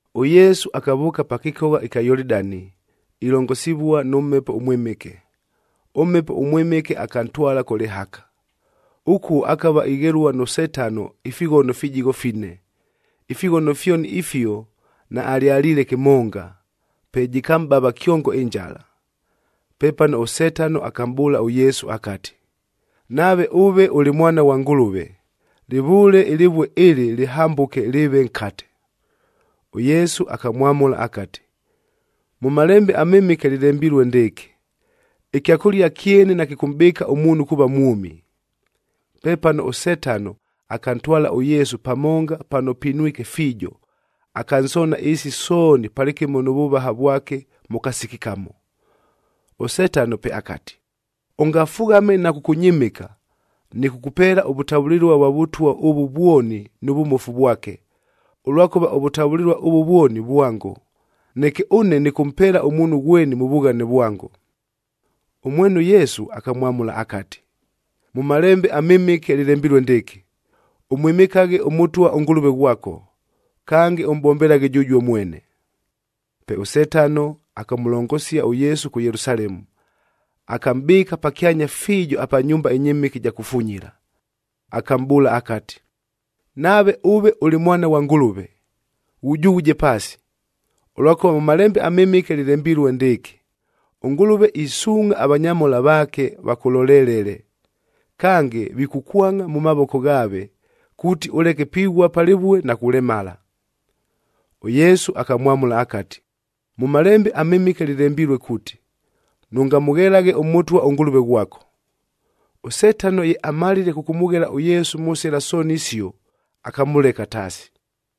ɄYesu akavʉʉka pa kɨkogha ɨkya Yolidani ilongosivua nʉ Mhepo ʉMwɨmɨke. ɄMhepo ʉMwɨmɨke akantwala kʉ lɨhaka. Ʉkuo akava ighelua nʉ Setano ifighono fijigho fine. Ifighono fyoni ifio naalyaliile kɨmonga, pe jɨkamʼbava kyongo ɨnjala. Pepano ʉSetano akamʼbʉʉla ʉYesu akati, “Nave ʉve ʉlɨ Mwana ghwa Ngʉlʉve, lɨvʉʉle ɨlɨvue ɨlɨ lɨhambʉke lɨɨve nkate.” ɄYesu akamwamʉla akati, “Mʉ Malembe aMɨmɨke lɨlembilue ndɨɨkɨ, ‘Ɨkyakʉlia kyene nakɨkʉmʼbɨɨka ʉmuunhu kuuva mwʉmi.’a” Pepano ʉSetano akantwala ʉYesu pamonga pano pinwike fiijo, akansoona ɨɨsi sooni palɨkɨmo nʉ vʉvaha vwake mʉ kasiki kamo. ɄSetano pe akati, “Ʉngafughame na kʉkʉnyɨmɨka, nɨkʉkʉpeela ʉvʉtavʉlɨlua vwa vʉtwa ʉvʉ vwoni nʉ vʉmofu vwake, ʉlwakʉva ʉvʉtavʉlɨlua ʉvʉ vwoni vwango, neke ʉne nɨkʉmpeela ʉmuunhu ghweni mʉ vughane vwango.” Ʉmwene ʉYesu akamwamʉla akati, “Mʉ Malembe aMɨmɨke lɨlembilue ndɨɨkɨ, ‘Ʉmwɨmɨkaghe ʉMʉtwa ʉNgʉlʉve ghwako, kange ʉmʼbombelaghe jʉjuo mwene.’b” Pe ʉSetano akamʉlongosia ʉYesu kʉ Yelusalemu, akamʼbɨɨka pakyanya fiijoc apa nyumba ɨnyɨmɨke ɨja kufunyila. Akamʼbʉʉla akati, “Nave ʉve ʉlɨ Mwana ghwa Ngʉlʉve, ghujughuje paasi, ʉlwakʉva mʉ Malembe aMɨmɨke lɨlembilue ndɨɨkɨ, ‘ɄNgʉlʉve isuungʼha avanyamhola vaake, Kange, ‘vikʉkwangʼa mʉ mavoko ghaave kuuti ʉleke pighua pa lɨvue na kulemala.’e” ɄYesu akamwamʉla akati, “Mʉ Malembe aMɨmɨke lɨlembilue kuuti, ‘Nʉngamʉghelaghe ʉMʉtwa, ʉNgʉlʉve ghwako.’f” ɄSetano ye amalile kʉkʉmʉghela ʉYesu mʉ sɨla sooni isio, akamʉleka taasi.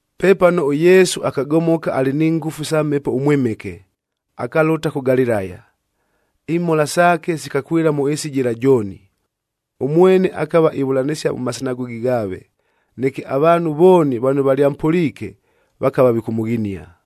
Pepano ʉYesu akagomoka alɨ ni ngʉfu sa Mhepo ʉMwɨmɨke, akalʉta kʉ Galilaya. Imhola saake sikakwɨla mʉ ɨɨsi jɨla jooni. Ʉmwene akava ivʉlanɨsia mʉ masinagogi ghaave,g neke avaanhu vooni vano valyampʉliike, vakava vikʉmʉghinia.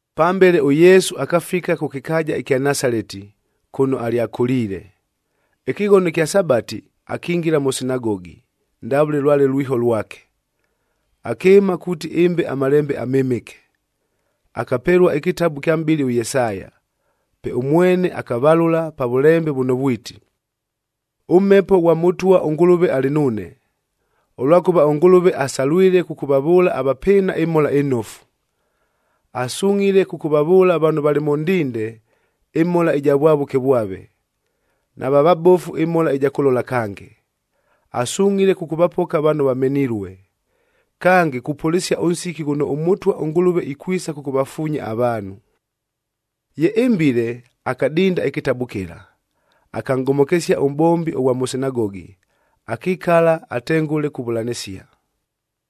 Pambele ʉYesu akafika kʉ kɨkaaja ɨkya Nasaleti, kʉno alyakʉliile. Ɨkɨghono ɨkya Sabatih akingila mʉ sinagogi, ndavʉle lwale lwiho lwake. Akɨɨma kuuti ɨmbe aMalembe aMɨmɨke. Akapelua ɨkɨtabu kya mʼbɨli ʉYesaya, pe ʉmwene akavalʉla pa vʉlembe vʉno vwiti, “ɄMhepo ghwa Mʉtwa ʉNgʉlʉve alɨ nuune, ʉlwakʉva ʉNgʉlʉve asalwilei kʉkʉvavʉʉla avapɨɨna ɨMhola ɨNofu. Asungʼhile kʉkʉvavʉʉla vano valɨ mʉ ndinde, ɨmhola ɨja vwavʉke vwave, nava vabofu ɨmhola ɨja kʉlola kange, asungʼhile kʉkʉvapoka vano vamenilue. Kange, kupʉlɨsia ʉnsiki ghʉno ʉMʉtwa ʉNgʉlʉve, ikwisa kʉkʉvafuunya avaanhu.” Ye ɨmbile, akadinda ɨkɨtabu kɨla, akanʼgomokesia ʉmʼbombi ʉghwa mʉ sinagogi, akikala atengʉle kuvʉlanɨsia.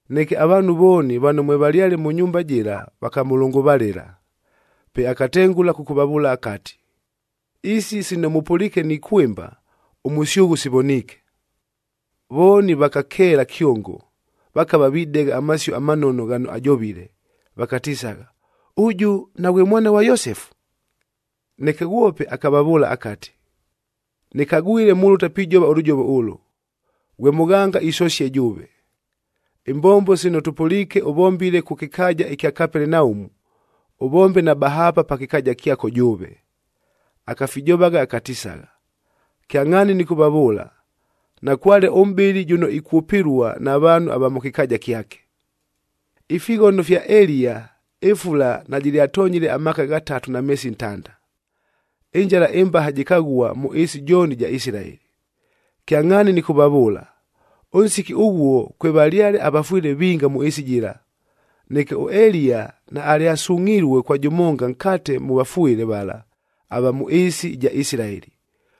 Neke avaanhu vooni vano mwevalyale mʉ nyumba jɨla vakamʉlʉngʉvalɨla. Pe akatengʉla kʉkʉvavʉʉla akati, “Isi sino mʉpʉliike nikwɨmba, ʉmʉsyʉghʉ sivoniike.” Vooni vakakeela kyongo, vakava videgha amasio amanono ghano ajovile, vakatisagha, “Ʉjʉ naghwe mwana ghwa Yosefu?” Neke ghwope akavavʉʉla akati, “Nɨkagwile, mulʉta pijova ʉlʉjovo ʉlʉ, ‘Ghwe mʉghanga, isosie jʉʉve!’ Imbombo sino tʉpʉliike ʉvombile kʉ kɨkaaja ɨkya Kapelenaumu, ʉvombe na bahaapa pa kɨkaaja kyako jʉʉve.” Akafijovagha akatisagha, “Kyangʼhaani nɨkʉvavʉʉla, nakwale ʉmʼbɨli jʉno ikwʉpɨlua na vaanhu ava mʉ kɨkaaja kyake. “Ifighono fya Eliya, ɨfula najɨlyatonyile amaaka ghatatu na meesi ntanda, ɨnjala ɨmbaha jɨkaghua mʉ ɨɨsi jooni ɨja Isilaeli. Kyangʼhaani nɨkʉvavʉʉla, ʉnsiki ʉghuo kwevalyale avafwɨle vinga mʉ ɨɨsi jɨla. Neke ʉEliya naalyasungʼhilue kwa jʉmonga nkate mʉ vafwɨle vala ava mʉ ɨɨsi ɨja Isilaeli,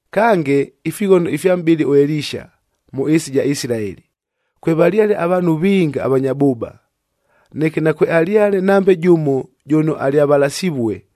Kange, ifighono ifya mʼbɨli ʉElisha mʉ ɨɨsi ɨja Isilaeli, kwevalyale avaanhu vinga avanya bʉʉba. Neke nakwealyale nambe jʉmo jʉno alyavalasivue,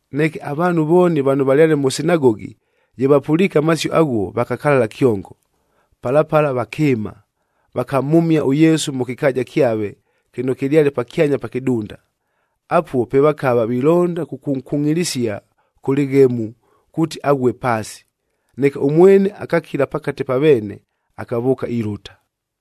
Neke avaanhu vooni vano valyale mʉ sinagogi, ye vapʉliike amasio aghuo, vakakalala kyongo. Pala pala, vakɨɨma, vakamhʉmia ʉYesu mʉ kɨkaaja kyave kɨno kɨlyale pakyanya pa kɨdunda. Apuo pe vakava vilonda kʉkʉnkungʼilisia kʉ lɨghemu kuuti aghue paasi. Neke ʉmwene akakila pakate pa veene, akavʉʉka ilʉta.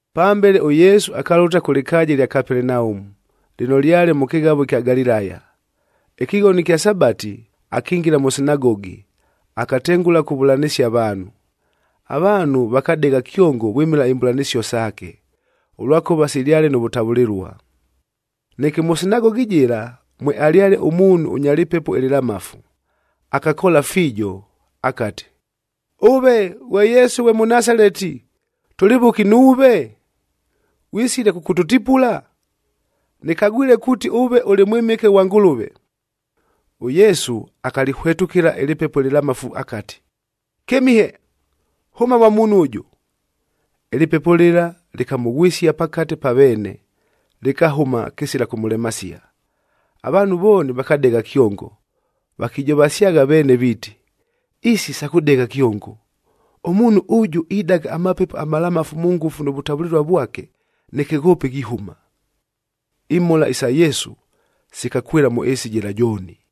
Pambele, ʉYesu akalʉta kʉ lɨkaaja ɨlya Kapelenaumu, lɨno lyale mʉ kɨghavo ɨkya Galilaya. Ɨkɨghono ɨkya Sabati, akingila mʉ sinagogi, akatengʉla kuvʉlanɨsia avaanhu. Avaanhu vakadegha kyongo vwɨmɨla imbʉlanɨsio saake, ʉlwakʉva silyale nʉ vʉtavʉlɨlua. Neke mʉ sinagogi jɨla, mwealyale ʉmuunhu ʉnya lɨpepo ɨlɨlamafu, akakoola fiijo, akati, “Ʉve ghwe Yesu ghwe Mʉnasaleti, tʉlɨ vʉki nuuve? Ghwisile kʉkʉtʉtipula? Nɨkagwile kuuti ʉve ʉlɨ Mwɨmɨke ghwa Ngʉlʉve.” ɄYesu akalɨhwetʉkɨla ɨlɨpepo ɨlɨlamafu akati, “Kɨmihe! Hʉma mwa muunhu ʉjʉ!” Ɨlɨpepo lɨla lɨkamʉghwɨsia pakate pa veene, lɨkahʉma kɨsila kʉmʉlemasia. Avaanhu vooni vakadegha kyongo, vakijovasyagha veene viiti, “Isi sa kʉdegha kyongo! Ʉmuunhu ʉjʉ idaga amapepo amalamafu mʉ ngʉfu nʉ vʉtavʉlɨlua vwake, neke ghoope ghihʉma!” Imhola isa Yesu sikakwɨla mʉ ɨɨsi jɨla jooni.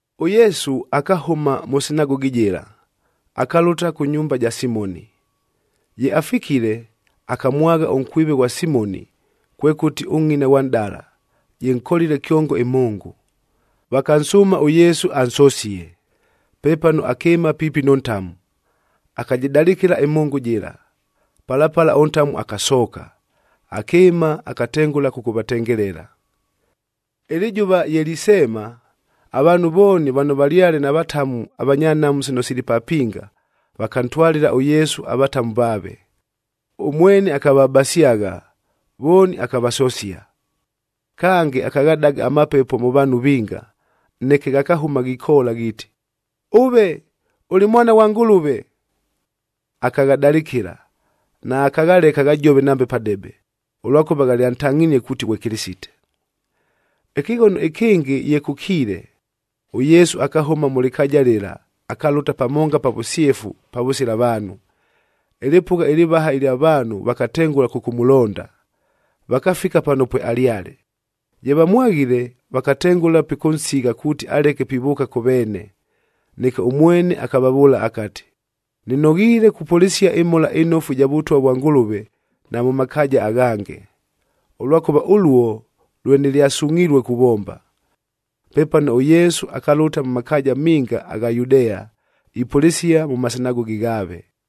ɄYesu akahʉma mʉ sinagogi jɨla, akalʉta kʉ nyumba ja Simoni.l Ye afikile, akamwagha ʉnkwive ghwa Simoni, kwekʉti ʉngʼina ghwa nʼdala, jɨnkolile kyongo ɨmhʉngʉ, vakansʉʉma ʉYesu ansosie. Pepano akɨɨma piipi nʉ ntamu, akajɨdalɨkɨla ɨmhʉngʉ jɨla, pala pala ʉntamu akasooka, akɨɨma akatengʉla kʉkʉvatengelela. Ɨlɨjʉva ye liseema, avaanhu vooni vano valyale na vatamu avanya nhamu sino sili papinga, vakantwalɨla ʉYesu avatamu vaave. Ʉmwene akavabasyagha, vooni akavasosia. Kange, akaghadaga amapepo mʉ vaanhu vinga, neke ghakahʉma ghikoola ghiiti, “Ʉve ʉlɨ Mwana ghwa Ngʉlʉve!” Akaghadalɨkɨla, naakaghaleka ghajove nambe padebe, ʉlwakʉva ghalyantangʼhinie kuuti ghwe Kɨlɨsite. Ɨkɨghono ɨkɨngɨ ye kʉkiile, ʉYesu akahʉma mʉ lɨkaaja lɨla akalʉta pamonga pa vʉsyefu pavʉsila vaanhu. Ɨlɨpʉgha ɨlɨvaha ɨlya vaanhu vakatengʉla kʉkʉmʉlonda, vakafika pano pwealyale. Ye vamwaghile, vakatengʉla pikʉnsigha kuuti aleke pivʉʉka kʉ veene. Neke ʉmwene akavavʉʉla akati, “Nɨnoghiile kupʉlɨsia ɨMhola ɨNofu ɨja Vʉtwa vwa Ngʉlʉve na mʉ makaaja aghange, ʉlwakʉva ʉluo lwe nɨlyasungʼhilue kuvomba.” Pepano ʉYesu akalʉta mʉ makaaja minga agha Yudea,m ipʉlɨsia mʉ masinagogi ghaave.